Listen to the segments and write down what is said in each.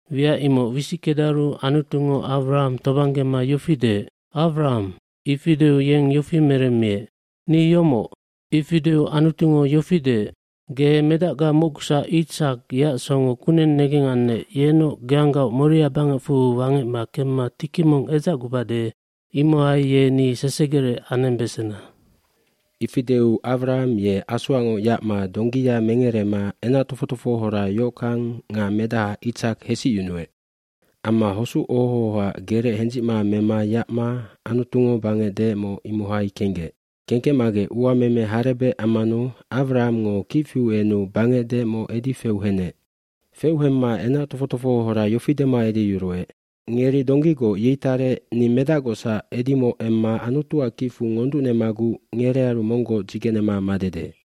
aWiac imoc wisickedaru Anutungo Awraham tobanggema yofi deec, “Awraham.” Ifi deu yeng yofi meremmiec, “Ni yomoc.” bIfi deu Anutungo yofi deec, “Ge medacga Itsak mocgusac yeac songo kuneng negengannec yenoc geanggaoc Moria bangecfu wangecma kemma tiki mong edzacgubade imohai ye ni sesegerec anembesena.” Ifi deu Awraham ye asoacngoc yacma donggiya mengerema enac tofoc tofohohora yohockang nga medaha Itsak hesicyunuec. Amma hosuc oho ohoac gerec hendzicma mema yacma Anutungo bangec deecmoc imohai kenggec. Kengkecmagec uameme harebec ammanu Awrahamngo kic fiu enu bangec deecmoc edi feu henec. Feu hemma enac tofoc tofohohora yofi dema edeyuruec, “Ngeri donggigoc yei tarec ni medacgocsac edimoc emma Anutuac kicfu ngonducnemaguc ngerearu monggoc dzigenema madede.”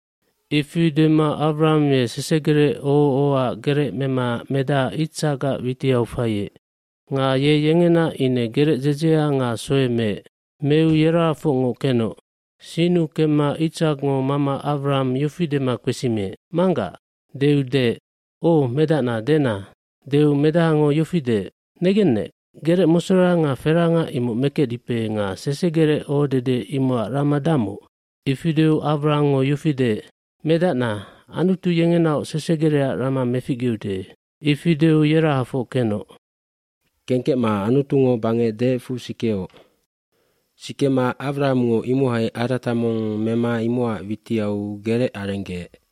Ifi dema Awraham ye sesegerec oho ohoac gerec mema medaha Itsakac witiau faiec. Nga ye yengena ine gerec dzedzea nga soe meec. Meu yerahafocngoc kenoc. Sinnu kemma Itsakngo mama Awraham yofi dema kpesimiec, “Manggac.” Deu deec, “Oc, medacna dena.” Deu medahango yofi deec, “Negennec, gerec mosora nga feranga imoc mekecdipe nga sesegerec ohodede imocac rama damoc?” Ifi deu Awrahamngo yofi deec, “Medacna, Anutu yengenaoc sesegerecac rama meficgeude.” Ifi deu yerahafoc kenoc. cKengkecma Anutungo bangec deecfu kensikeoc. Sikema Awrahamngo imohai arata mong mema imocac witiau gerec arenggeec.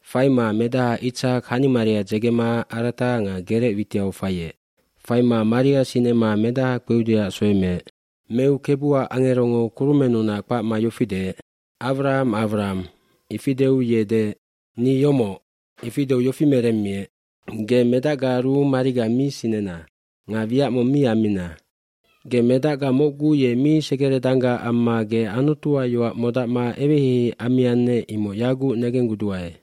Faima medaha Itsak hanimaria dzegema arata nga gerec witiau faiec. dFaima maria sinema medaha kpeudeac soe meec. Meu Kebuac angerongo kurumennunac kpacma yofi deec, “Awraham, Awraham.” Ifi deu ye deec, “Ni yomoc.” eIfi deu yofi meremmiec, “Ge medacgaaru mariga mi sinena nga wiac mong mi ammina. Ge medacga mocgu ye mi segerenendanggac amma ge Anutuac yoac modacma eweheihei ammiannec imoc yaguc negengguduae.”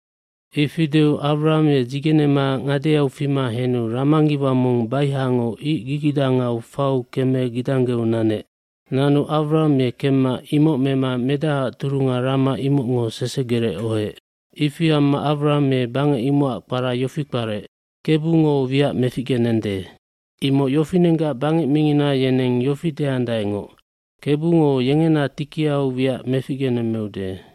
Ifi deu Awraham ye dzigenema ngadeau fima henu ramangiwa mong baihango ic gigidangau fau keme gidanggeu nanec. Nanu Awraham ye kemma imoc mema medahaac turunga rama imocngo sesegerec ohoec. Ifi amma Awraham ye bangec imocac kpara yofi kparec, “Kebungo wiac meficgenende,” imoc yofinenggac bangec mingina yeneng yofi deandaengoc, “Kebungo yengena tikiauf wiac meficgenemmeude.”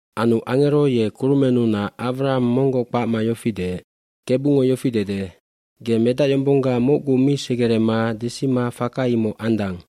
Anu angero ye kurumennunac Awraham monggoc kpacma yofi deec, g“Kebungo yofi dede, ‘Ge medacyombongga mocgu mi segerema desima faka imoc andang.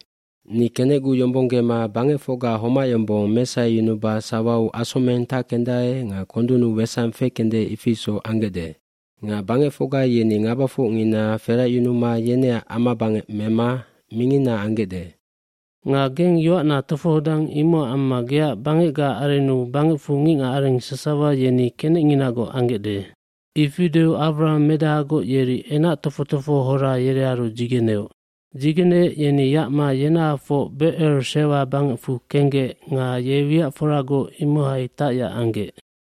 hni kenecguyombonggema bangecfocga homac yombong mesaheyunuba sawau asomeng tackendae nga kondunnu sangi fekende ifi isoc ambesande. Nga bangecfocga yeni ngabafocngina feracyunuma yeneac amabangec mema mingina ambesande. jNga geng yoacna tofohodang imocac amma geac bangecgaac arennu bangecfu ngicngacareng sasawa kenecnginagoc ambesandae.’”i Ifi deu Awraham medahagoc yeri enac tofoc tofohohora yerearu dzigeneoc. Dzigeneec yeni yacma yenahafoc Becer Sewa bangecfu kenggec nga ye wiacforagoc imohai tacyac anggec.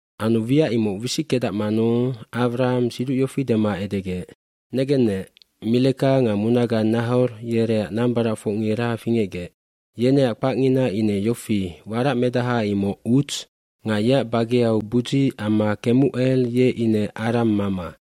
Anu wiac imoc wisickedacmanu Awraham siduc yofi dema edegec, “Negennec, Mileka nga munaga Nahor yereac nambaracfocngira fingecgec. Yeneac kpacngina ine yofi waracmedaha imoc Uts nga yeac bageau Budzi amma Kemucel ye ine Aram mama.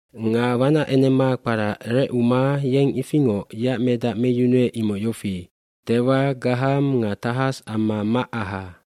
Nga wanacenemak kpara Recuma yeng ifingoc yeac medac meyunuec imoc yofi, Tewa, Gaham nga Tahas amma Macaha.